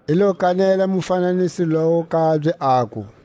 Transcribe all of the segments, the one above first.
I lo kanela mufananiso lowu kabye, aku: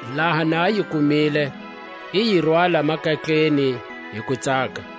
Laha na a yi kumile, i yi rwala makatleni hi kutsaka.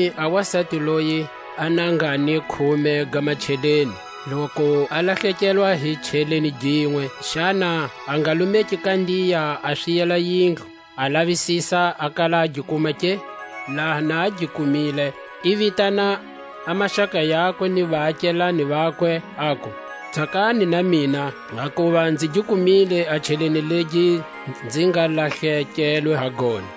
Kutani a wasati loyi a na nga ni khume ga macheleni, loku a lahlekelwa hi cheleni ginwe, xana a nga lumeki kandiya, a swiyela yindlu, a lavisisa a kala a gi kuma ke? Laha na a gi kumile, i vitana a maxaka yakwe ni vaakelane vakwe, aku: Tsakani na mina, hakuva nzi gi kumile a cheleni legi nzi nga lahlekelwe ha gona.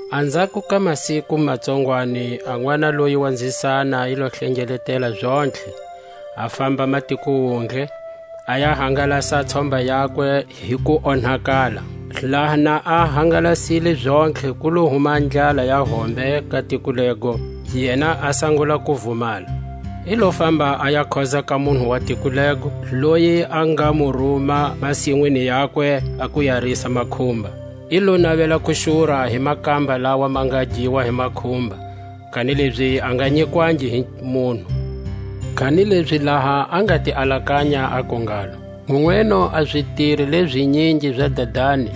Anzhako ka masiku ma tsongwani, a nʼwana loyi wa nzisana i lo hlengeletela zontlhe, a famba matiko wundle; a ya hangalasa a tshomba yakwe hi kuonhakala. Laha na a hangalasile zontlhe, ku lo huma a ndlala ya hombe ka tiko lego, yena a sangula ku vumala. I lo famba a ya khoza ka munhu wa tiko lego; loyi a nga mu ruma masinwini yakwe a ku ya risa makhumba. I lo navela ku xura hi makamba lawa ma giwako hi makhumba; kanilezi a nga nyikwangi hi munhu. Kanilezi laha a nga ti alakanya, aku ngalo: Nweno a zitiri leʼzinyingi za dadani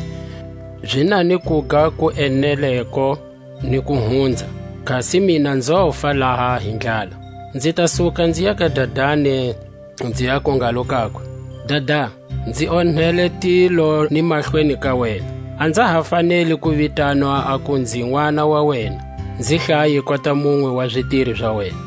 zi na ni kuga ku eneleko ni ku hunza, kasi mina nzofa laha hi ndlala! Nzi ta suka nziya ka dadani, nzi ya ku ngalo kakwe: Dada, nzi onhele tilo ni mahlweni ka wena; a nza ha faneli ku vitanwa aku nzi nʼwana wa wena; nzi hlaye kota munwe wa zitiri za wena.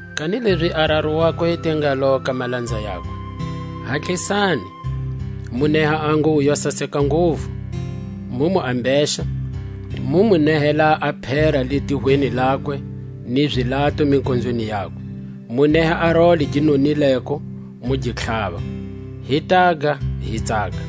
Kanilezi a raru wakwe i te ngalo ka malanza yakwe: Hatlisani, mu neha a nguwo yo saseka nguvu, mu mu ambexa; mu mu mehela a phera litihweni lakwe, ni zilato mikonzweni yakwe; mu neha a role gi nonileko, mu gi tlhava; hi taga, hi tsaka: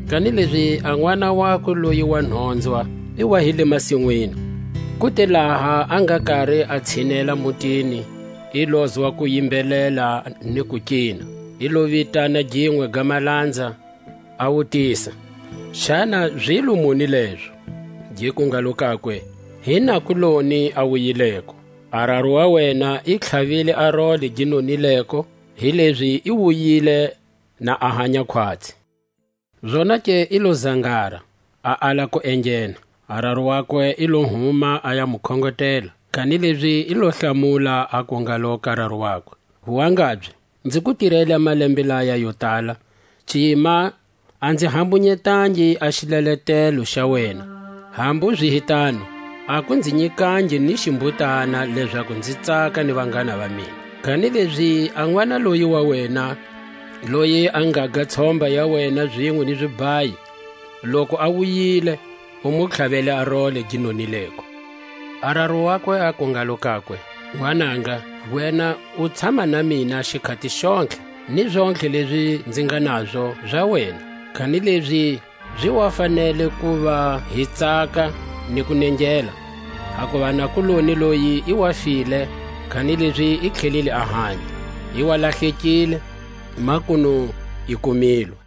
Kanilezi a nʼwana wakwe loyi wa nhonzwa i wa hi le masinwini; ku te laha a nga kari a tshinela mutini, i lozwa kuyimbelela ni kukina. I lo vitana ginwe ga malanza, a wutisa, xana zilo muni lezo. Giku ngalo kakwe: Hi nakuloni a wuyileko; a raru Wa wena i tlhavile a role gi nonileko, hilezi i wuyile na a hanya khwatsi. Zonake i lo zangara, a ala ku enghena; a raru wakwe i lo huma a ya mu khongotela. Kanilezi i lo hlamula, aku ngalo ka raru wakwe: Wangabye, nzi ku tirele a malembe laya yo tala, cima a nzi hambunyetangi a xileletelo xa wena; hambu zi hi tano, a ku nzi nyikangi ni ximhutana, lezaku nzi tsaka ni vanghana va mina; kanilezi a nʼwana loyi wa wena, loyi a ngaga tshomba ya wena zinwe ni zibhayi, loku a wuyile, u mu tlhavele a role gi nonileko. A raru wakwe aku ngalo kakwe: Nwananga, wena u tshama na mina xikhati xontlhe, ni zontlhe lezi nzi nga nazo, za wena. Kanilezi zi wa fanele ku va hi tsaka ni ku nengela; hakuva a nakuloni loyi i wa file, kanilezi i tlhelile a hanya; i wa lahlekile, makunu i kumilwe.